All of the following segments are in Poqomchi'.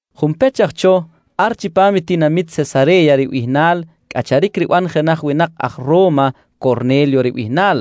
Junpech aj cho, ar chipam i tinamit Sesare̱ya ribihnal cꞌacharic riban jenaj winak aj Ro̱ma Corne̱lyo ribihnal,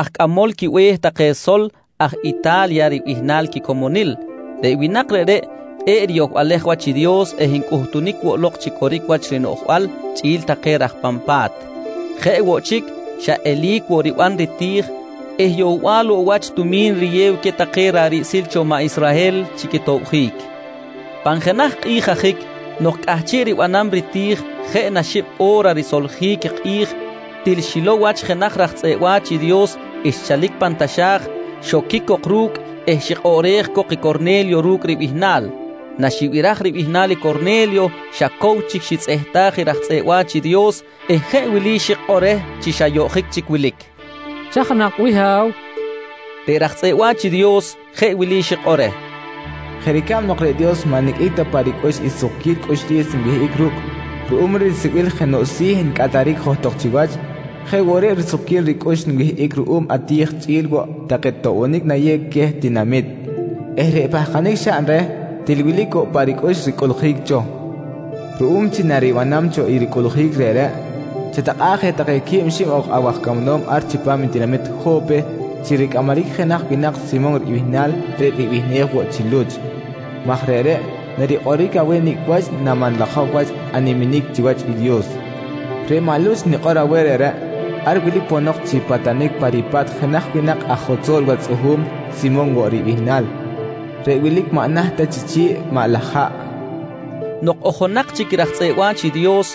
aj cꞌamol quibe̱h take sol aj Ita̱lya ribihnal quicomonil. Reꞌ winak reꞌreꞌ kꞌe̱ꞌ riyohbalej wach i Dios eh ncꞌutunic woꞌ lok chi coric wach rinoꞌjbal chꞌi̱l take raj pan pa̱t. Jeꞌ woꞌ chic, xa eli̱c woꞌ riban riti̱j eh yohbal woꞌ wach tumi̱n riyew queh take ra̱ꞌ riꞌsil cho i maꞌ Israhel chi quitobjic. Pan jenaj kꞌi̱j ajic nok cꞌahchiꞌ ribanam riti̱j jeꞌ na xib o̱ra risoljic i kꞌi̱j, til xilow wach jenaj raj tzꞌeꞌ wa̱ch i Dios xchalic pan taxa̱j, xoquic cok ru̱cꞌ eh xikꞌoꞌrej cok i Corne̱lyo ru̱cꞌ ribihnal. Naxibiraj ribihnal i Corne̱lyo, xa cow chic xitzꞌehtaj i raj tzꞌeꞌ wa̱ch i Dios eh jeꞌ wili xikꞌor reh chi xa yoꞌjic chic wilic: «Chaj nak bih Ha̱w? nqui reh. Reꞌ raj tzꞌeꞌ wa̱ch i Dios jeꞌ wili xikꞌor reh: «Jeꞌ ricab nok reꞌ Dios maꞌ niqꞌuic ta pa ricꞌux i sukquil cꞌuxlis nwihꞌic ru̱cꞌ ruꞌum risibil jenoꞌ si̱ ncꞌataric johtok chiwach, jeꞌ woꞌ reꞌ risukquil ricꞌux nwihꞌic ruꞌum ati̱j chꞌi̱l woꞌ take toꞌbonic nayew queh tinamit eh reꞌ pahkanic xaꞌn reh, til wilic woꞌ pa ricꞌux ricꞌuꞌljic cho. Ruꞌum chi naribanam cho i ricꞌuꞌljic reꞌreꞌ, chatakꞌa̱ꞌ je take quib xib ok awaj camanom ar chipam i tinamit Jo̱pe chi ricꞌamaric i jenaj winak Simon ribihnal reꞌ ribihnej woꞌ chi Luch maj reꞌreꞌ narikꞌoric aweh nicꞌ wach namanlajok wach animinic chiwach i Dios. Reꞌ maꞌ Luch nikꞌor aweh reꞌreꞌ, ar wilic ponok chi patanic pa ripa̱t jenaj winak aj jotzol wach tzꞌuhu̱m Simon woꞌ ribihnal reꞌ wilic maꞌ naht ta chi chi̱ꞌ maꞌ laj haꞌ, nqui xikꞌor i raj tzꞌeꞌ wa̱ch i Dios.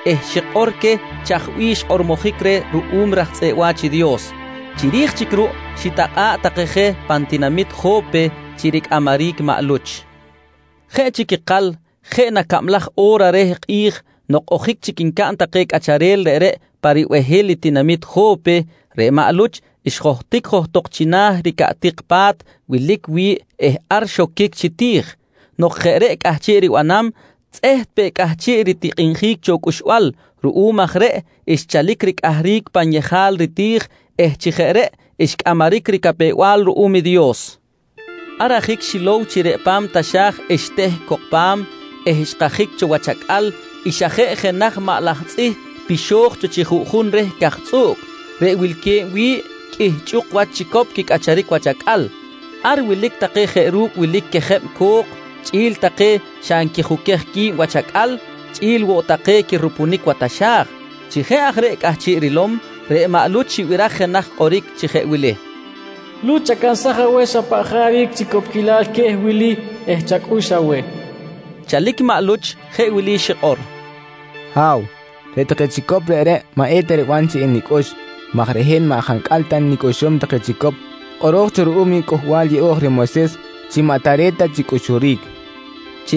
eh xikꞌor queh chaj bih xkꞌormojic reh ruꞌum raj tzꞌeꞌ wa̱ch i Dios. Chiri̱j chic ruꞌ xitakꞌa̱ꞌ take je pan tinamit Jo̱pe chi ricꞌamaric maꞌ Luch. Jeꞌ chic ikal jeꞌ na cablaj o̱ra reh kꞌi̱j nok ojic chic ncaꞌn take cꞌacharel reꞌreꞌ pa ribehil i tinamit Jo̱pe, reꞌ maꞌ Luch xjohtic johtok china̱ ricaꞌtik pa̱t wilic wi̱ꞌ eh ar xoquic chi ti̱j. Nok jeꞌ reꞌ cꞌahchiꞌ ribanam, tzꞌeht peꞌ cꞌahchiꞌ ritikꞌinjic cho cꞌuxbal. Ruꞌum aj reꞌ xchalic ricꞌahric pan yejal riti̱j eh chi jeꞌ reꞌ xcꞌamaric ricapew-bal ruꞌum i Dios. Ar ajic xilow chi reꞌ pan taxa̱j xteh cok pa̱m eh xkajic cho wach acꞌal i xa jeꞌ jenaj maꞌ laj tzꞌih pixo̱j cho chi juꞌjun reh ricajtzꞌuꞌc, reꞌ wilque̱b wi̱ꞌ qꞌuih chꞌuk wach chicop quicꞌacharic wach acꞌal. Ar wilic take jeꞌ ru̱cꞌ wilic quejeb cok, chꞌi̱l take xa nquijuquej qui̱b wach acꞌal, chꞌi̱l woꞌ take quirupunic wa taxa̱j. Chi jeꞌ aj reꞌ cꞌahchiꞌ rilom, reꞌ maꞌ Luch xibiraj jenaj kꞌoric chi jeꞌ wili: «Luch, chacansaj aweh xa paꞌ jaric chicopquilal queh wili eh chacꞌux aweh, nqui xibiraj. Chalic i maꞌ Luch jeꞌ wili xikꞌor: «Ha̱w, reꞌ take chicop reꞌreꞌ maꞌeta riban chi enicꞌux maj reꞌ hin maꞌ jancꞌal ta nicꞌuxum take chicop kꞌoro̱j cho ruꞌum i Cꞌuhbal Yeꞌo̱j reh Moyses chi maꞌ tare̱t ta chi cꞌuxuric, nqui xikꞌor maꞌ Luch.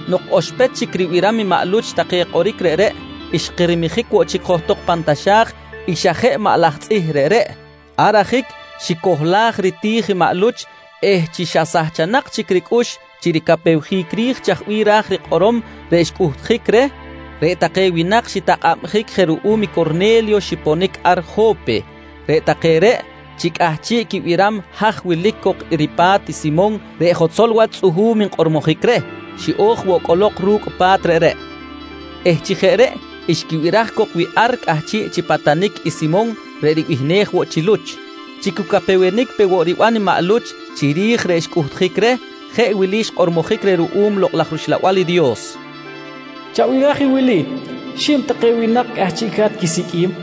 Nok oxpech chic ribiram i maꞌ Luch take kꞌoric reꞌreꞌ, xkirmijic woꞌ chic johtok pan taxa̱j i xa jeꞌ maꞌ laj tzꞌih reꞌreꞌ. Ar ajic, xicohlaj riti̱j i maꞌ Luch eh chi xa nsahchic chic ricꞌux chi ricapewjic ri̱j chaj bih ra̱j rikꞌorom reꞌ xcꞌuhtjic reh, reꞌ take winak xitakꞌabjic je ruꞌum i Corne̱lyo xiponic ar Jo̱pe. Reꞌ take reꞌ chi cꞌahchiꞌ quibiram haj wilic cok ripa̱t i Simon reꞌ jotzol wach tzꞌuhu̱m nkꞌormojic reh, xiꞌo̱j woꞌ cꞌolok ru̱cꞌ pa̱t reꞌreꞌ eh chi jeꞌ reꞌ xquibiraj cok wi ar cꞌahchiꞌ chi patanic i Simon reꞌ ribihnej woꞌ chi Luch. Chi cu capewenic pe woꞌ riban i maꞌ Luch chiri̱j reꞌ xcꞌuhtjic reh, jeꞌ wili xkꞌormojic reh ruꞌum Lokꞌ laj rUxlabal i Dios: «Chabiraj i wili: Xib take winak cꞌahchiꞌca̱t quisiqꞌuim.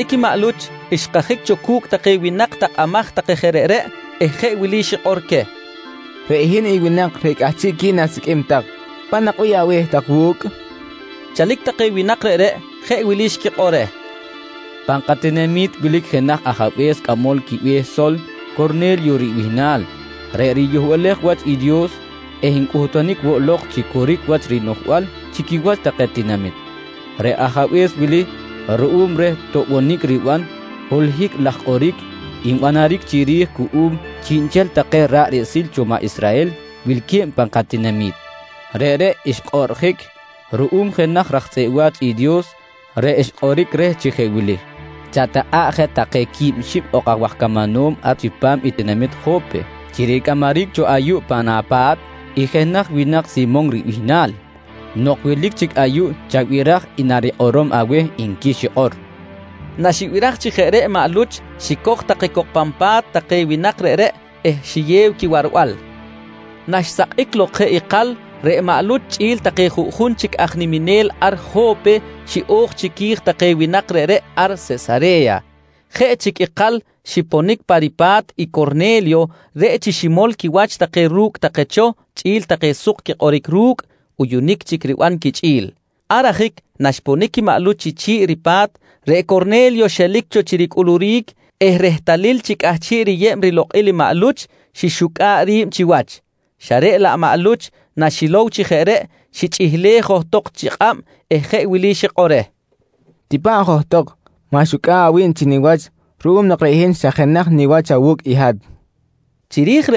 Chalic i maꞌ Luch xkajic cho cu̱cꞌ take winak takꞌamaj take je reꞌreꞌ eh jeꞌ wili xikꞌor queh: «Reꞌ hin i winak reꞌ cꞌahchiꞌqui̱n asiqꞌuim tak. Paꞌ nak bih abe̱h tak wu̱cꞌ, nqui queh. Chalic take winak reꞌreꞌ jeꞌ wili xquikꞌor reh: «Pan katinami̱t wilic jenaj ajabe̱s cꞌamol quibe̱h sol Corne̱lyo ribihnal reꞌ riyohbalej wach i Dios eh ncꞌutunic woꞌ lok chi coric wach rinoꞌjbal chi quiwach take tinamit. Reꞌ ajabe̱s wili, ruꞌum reh toꞌbonic riban, holohic laj kꞌoric nbanaric chiri̱j cuꞌum chiꞌnchel take ra̱ꞌ riꞌsil cho maꞌ Israhel wilque̱b pan katinami̱t. Reꞌreꞌ, xkꞌoꞌrjic ruꞌum jenaj raj tzꞌeꞌ wa̱ch i Dios reꞌ xkꞌoric reh chi jeꞌ wili: ‹Chatakꞌa̱ꞌ je take quib xib ok awaj camanom ar chipam i tinamit Jo̱pe chi ricꞌamaric cho ayuꞌ pan apa̱t i jenaj winak Simon ribihnal. Nok wilic chic ayuꞌ chabiraj i narikꞌorom aweh nqui xikꞌor, nqui take reh. Naxibiraj chi jeꞌ reꞌ maꞌ Luch xicoj take cok pan pa̱t take winak reꞌreꞌ eh xiyew quiwarbal. Naxsakꞌic lok jeꞌ ikal, reꞌ maꞌ Luch chꞌi̱l take juꞌjun chic aj niminel ar Jo̱pe xiꞌo̱j chiqui̱j take winak reꞌreꞌ ar Sesare̱ya. Jeꞌ chic ikal xiponic pa ripa̱t i Corne̱lyo reꞌ chi ximol quiwach take ru̱cꞌ take cho chꞌi̱l take suk quikꞌoric ru̱cꞌ, uyunic chic riban quichꞌi̱l. Ar ajic naxponic i maꞌ Luch chi chi̱ꞌ i ripa̱t, reꞌ Corne̱lyo xelic cho chi ricꞌuluric eh rehtalil chi cꞌahchiꞌ riyeb rilokꞌil i maꞌ Luch, xixucꞌa̱ꞌ ri̱b chiwach, xa reꞌ laꞌ maꞌ Luch naxilow chi jeꞌ reꞌ, xichꞌihlej johtok chi kꞌab eh jeꞌ wili xikꞌor reh: «Tipa̱ꞌ johtok. Ma̱xucꞌa̱ꞌ awi̱b chiniwach ruꞌum nok reꞌ hin xa jenaj niwach awu̱cꞌ i hat, nqui reh.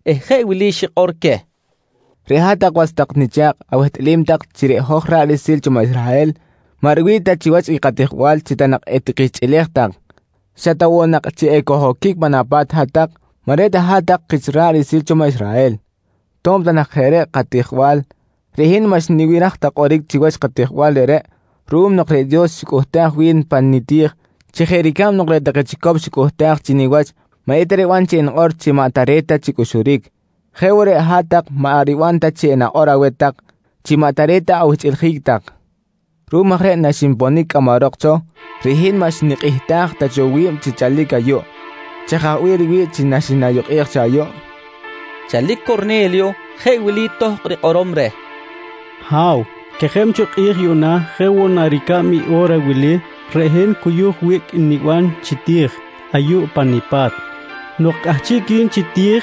eh jeꞌ wili xikꞌor queh: «Reꞌ hat-tak was tak nicha̱kꞌ awehtꞌalim tak chi reꞌ hoj ra̱ꞌ riꞌsil cho maꞌ Israhel maꞌ riwi̱ꞌ ta chiwach i katijbal chi ta nak etikihchꞌilej tak, xa ta woꞌ nak chi ekoj-oquic pan apa̱t hat-tak maꞌ reꞌ ta hat-tak kich ra̱ꞌ riꞌsil cho maꞌ Israhel. To̱b ta nak jeꞌ reꞌ katijbal, reꞌ hin maꞌ xnibiraj ta kꞌoric chiwach katijbal reꞌreꞌ ruꞌum nok reꞌ Dios xicꞌuhtaj wi̱n pa niti̱j chi jeꞌ ricab nok reꞌ take chicop xicꞌuhtaj chi niwach maꞌeta riban chi enikꞌor chi maꞌ tare̱t ta chi cꞌuxuric, jeꞌ woꞌ reꞌ hat-tak maꞌ riban ta chi enikꞌor aweh tak chi maꞌ tare̱t ta awihchꞌiljic tak. Ruꞌum aj reꞌ naxinponic cꞌamarok cho, reꞌ hin maꞌ xnikꞌihtaj ta cho wi̱b chi chalic ayuꞌ. Chaj aj bih riwi̱ꞌ chi naxinayukꞌej cho ayuꞌ? nqui maꞌ Luch. Chalic Corne̱lyo jeꞌ wili tohkꞌ rikꞌorom reh: «Ha̱w, quejeb cho kꞌi̱j yuꞌna jeꞌ woꞌ na ricab i o̱ra wili, reꞌ hin cuyuj wiꞌc niban chi ti̱j ayuꞌ pa nipa̱t. Nok cꞌahchiꞌqui̱n chi ti̱j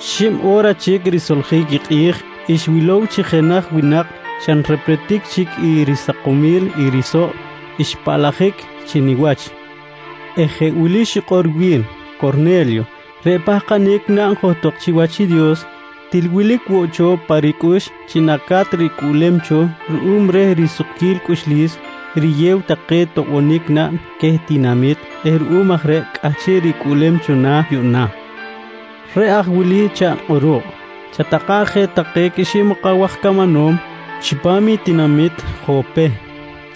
xib o̱ra chic risoljic i kꞌi̱j, xwilow chi jenaj winak xa nrepretic chic risakomil i risoꞌ xpaꞌlajic chi niwach eh jeꞌ wili xikꞌor wi̱n: ‹Corne̱lyo, reꞌ pahkanic naꞌn johtok chiwach i Dios til wilic woꞌ cho pa ricꞌux chi naca̱t ricꞌuꞌlem cho ruꞌum reh risukquil cꞌuxlis riyew take toꞌbonic naꞌn queh tinamit eh ruꞌum aj reꞌ cꞌahchiꞌ ricꞌuꞌlem cho na̱ yuꞌna. Reꞌ aj wili chaꞌn kꞌuruꞌ: Chatakꞌa̱ꞌ je take quib xib ok awaj camanom chipam i tinamit Jo̱pe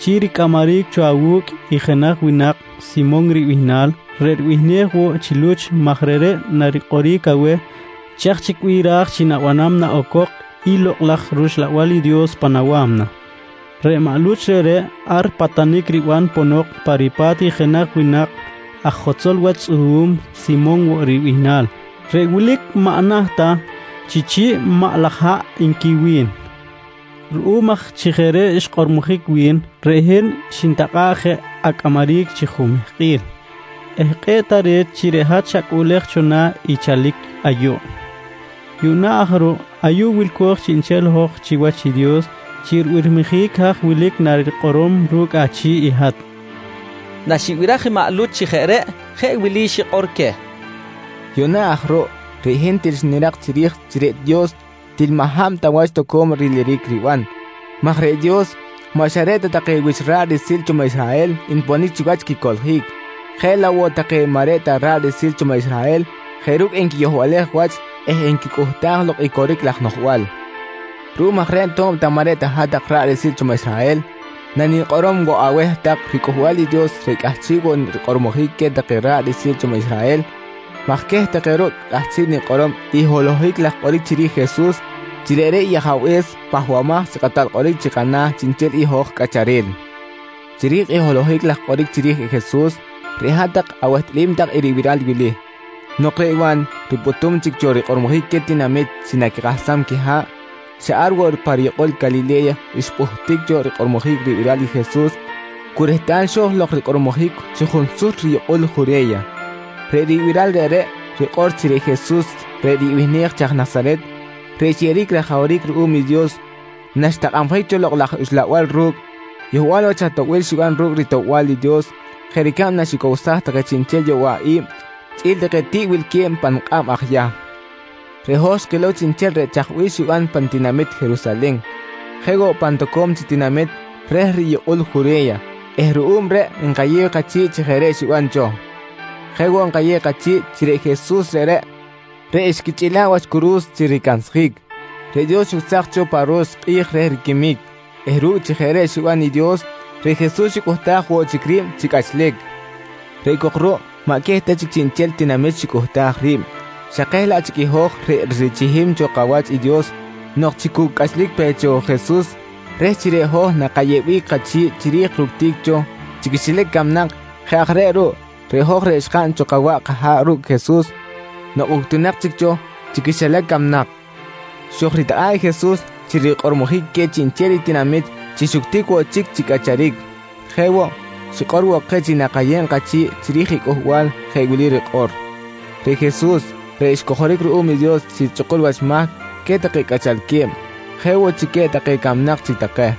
chi ricꞌamaric cho awu̱cꞌ i jenaj winak Simon ribihnal reꞌ ribihnej woꞌ chi Luch maj reꞌreꞌ narikꞌoric aweh chaj chic bih raj chi na̱banam naꞌocok i Lokꞌ laj rUxlabal i Dios pan awa̱mna. Reꞌ maꞌ Luch reꞌreꞌ, ar patanic riban ponok pa ripa̱t i jenaj winak aj jotzol wach tzꞌuhu̱m, Simon woꞌ ribihnal reꞌ wilic maꞌ naht ta chi chi̱ꞌ maꞌ laj haꞌ, nqui wi̱n. «Ruꞌum aj chi jeꞌ reꞌ xkꞌormojic wi̱n, reꞌ hin xnitakꞌa̱ꞌ je acꞌamaric chi jumehkꞌil eh kꞌe̱ꞌ tare̱t chi reꞌ hat xacꞌuꞌlej cho na̱ i chalic ayuꞌ. Yuꞌna aj ruꞌ, ayuꞌ wilco̱j chiꞌnchel hoj chiwach i Dios chi ribirmijic haj wilic narikꞌorom ru̱cꞌ achi̱ꞌ i hat, nqui Corne̱lyo. Naxibiraj i maꞌ Luch chi jeꞌ reꞌ, jeꞌ wili xikꞌor queh: «Yuꞌna aj ruꞌ reꞌ hin til xnirak chiri̱j chi reꞌ Dios til maꞌ hab ta wach toco̱m riliric riban maj reꞌ Dios maꞌ xa reꞌ ta take wich ra̱ꞌ riꞌsil cho maꞌ Israhel nponic chiwach quicoꞌljic, jeꞌ laꞌ woꞌ take maꞌ reꞌ ta ra̱ꞌ riꞌsil cho maꞌ Israhel jeꞌ ru̱cꞌ nquiyohbalej wach eh nquicꞌuhtaj lok i coric laj noꞌjbal. Ruꞌum aj reꞌ to̱b ta maꞌ reꞌ hat-tak ra̱ꞌ riꞌsil cho maꞌ Israhel, nanikꞌorom woꞌ aweh tak riCꞌuhbal i Dios reꞌ cꞌahchiꞌ woꞌ rikꞌormojic queh take ra̱ꞌ riꞌsil cho maꞌ Israhel maj queh take ruꞌ cꞌahchiꞌ nikꞌorom i holohic laj kꞌoric chiri̱j i Jesus chi reꞌreꞌ i Ajabe̱s Pahbamaj chi Kꞌatal Kꞌoric chi kana̱ chiꞌnchel i hoj cꞌacharel. «Chiri̱j i holohic laj kꞌoric chiri̱j i Jesus, reꞌ hat-tak awehtꞌalim tak i ribiral wili: Nok reꞌ Wa̱n ripꞌutum chic cho rikꞌormojic queh tinamit chi naquikahsam quiha̱ꞌ, xa ar woꞌ pa riyukꞌul Calile̱ya xpꞌuhtic cho rikꞌormojic ribiral i Jesus cu rehtal xo̱j lok rikꞌormojic chi junsut riyukꞌul Jure̱ya. Reꞌ ribiral reꞌreꞌ rikꞌor chi reꞌ Jesus reꞌ ribihnej chi aj Nasaret reꞌ xyeꞌeric rajawric ruꞌum i Dios naxtakꞌabjic cho Lokꞌ laj Uxlabal ru̱cꞌ, yohbal wach atoꞌbil xiban ru̱cꞌ ritoꞌbal i Dios jeꞌ ricab naxicowsaj take chiꞌnchel yowaꞌi̱b chꞌi̱l take tiꞌ wilque̱b pan kꞌab aj Yahm. «Reꞌ hoj xkilow chiꞌnchel reꞌ chaj bih xiban pan tinamit Jerusalen, jeꞌ woꞌ pan toco̱m chic tinamit reh riyukꞌul Jure̱ya eh ruꞌum reꞌ nkayew kachi̱ꞌ chi jeꞌ reꞌ xiban cho. Jeꞌ woꞌ nkayew kachi̱ꞌ chi reꞌ Jesus reꞌreꞌ, reꞌ xquichꞌila̱ꞌ wach curu̱s chi ricansjic, reꞌ Dios xucsaj cho pa ro̱x kꞌi̱j reh riquimic eh ru̱cꞌ chi jeꞌ reꞌ xiban i Dios, reꞌ Jesus xicꞌuhtaj woꞌ chic ri̱b chi cꞌachlic. Reꞌ cok ruꞌ maꞌ queh ta chic chiꞌnchel tinamit xicꞌuhtaj ri̱b, xa keh laꞌ chic i hoj reꞌ richihim cho kawach i Dios nok chi cu cꞌachlic pe cho Jesus reh chi reꞌ hoj nakayeꞌbic kachi̱ꞌ chiri̱j ructic cho chi quixilac camnak. Jeꞌ aj reꞌ ruꞌ, reꞌ hoj reꞌ xkaꞌn cho kawaꞌ kaha̱ꞌ ru̱cꞌ Jesus nok uctunak chic cho chi quixilac camnak, xojritakꞌa̱ꞌ i Jesus chi rikꞌormojic queh chiꞌnchel i tinamit chi xuctic woꞌ chic chi cꞌacharic. Jeꞌ woꞌ, xikꞌor woꞌ keh chi nakayeb kachi̱ꞌ chiri̱j i cꞌuhbal jeꞌ wili rikꞌor: ‹Reꞌ Jesus reꞌ xcojoric ruꞌum i Dios chi chꞌukul wach mahc queh take cꞌachalque̱b, jeꞌ woꞌ chi queh take camnak chic take,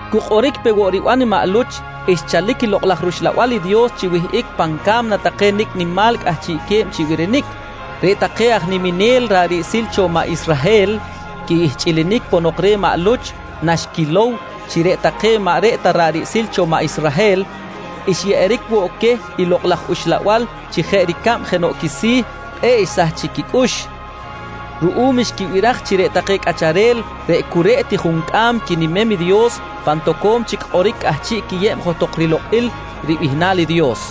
Cu kꞌoric pe woꞌ riban i maꞌ Luch, xchalic i Lokꞌ laj rUxlabal i Dios chi wihꞌic pan ca̱mna take nicꞌ nimal cꞌahchiꞌque̱b chi birinic. Reꞌ take aj niminel ra̱ꞌ riꞌsil cho take maꞌ Israhel quihchꞌilinic ponok reh maꞌ Luch, naxquilow chi reꞌ take maꞌ reꞌ ta ra̱ꞌ riꞌsil cho maꞌ Israhel xyeꞌeric woꞌ queh i Lokꞌ laj Uxlabal chi jeꞌ ricab jenoꞌ quisi̱, kꞌe̱ꞌ xsahchic quicꞌux ruꞌum xquibiraj chi reꞌ take cꞌacharel reꞌ cu reꞌ ti juncꞌam quinimem i Dios, pan toco̱m chic kꞌoric cꞌahchiꞌ quiyeb johtok rilokꞌil ribihnal i Dios.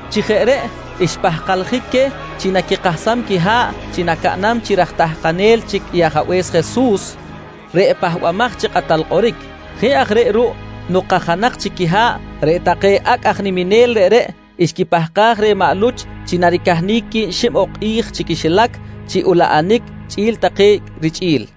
Chi jeꞌ reꞌ xpahkaljic queh chi naquikahsam quiha̱ꞌ chi nacaꞌnam chi raj tahkanel chic Ajabe̱s Jesus reꞌ Pahbamaj chi Kꞌatal Kꞌoric. Jeꞌ aj reꞌ ruꞌ nok kajanak chic quiha̱ꞌ, reꞌ take acꞌ aj niminel reꞌreꞌ xquipahkaj reh maꞌ Luch chi naricahnic quib xib ok kꞌi̱j chi quixilac chi ulaꞌanic chꞌi̱l take richꞌi̱l.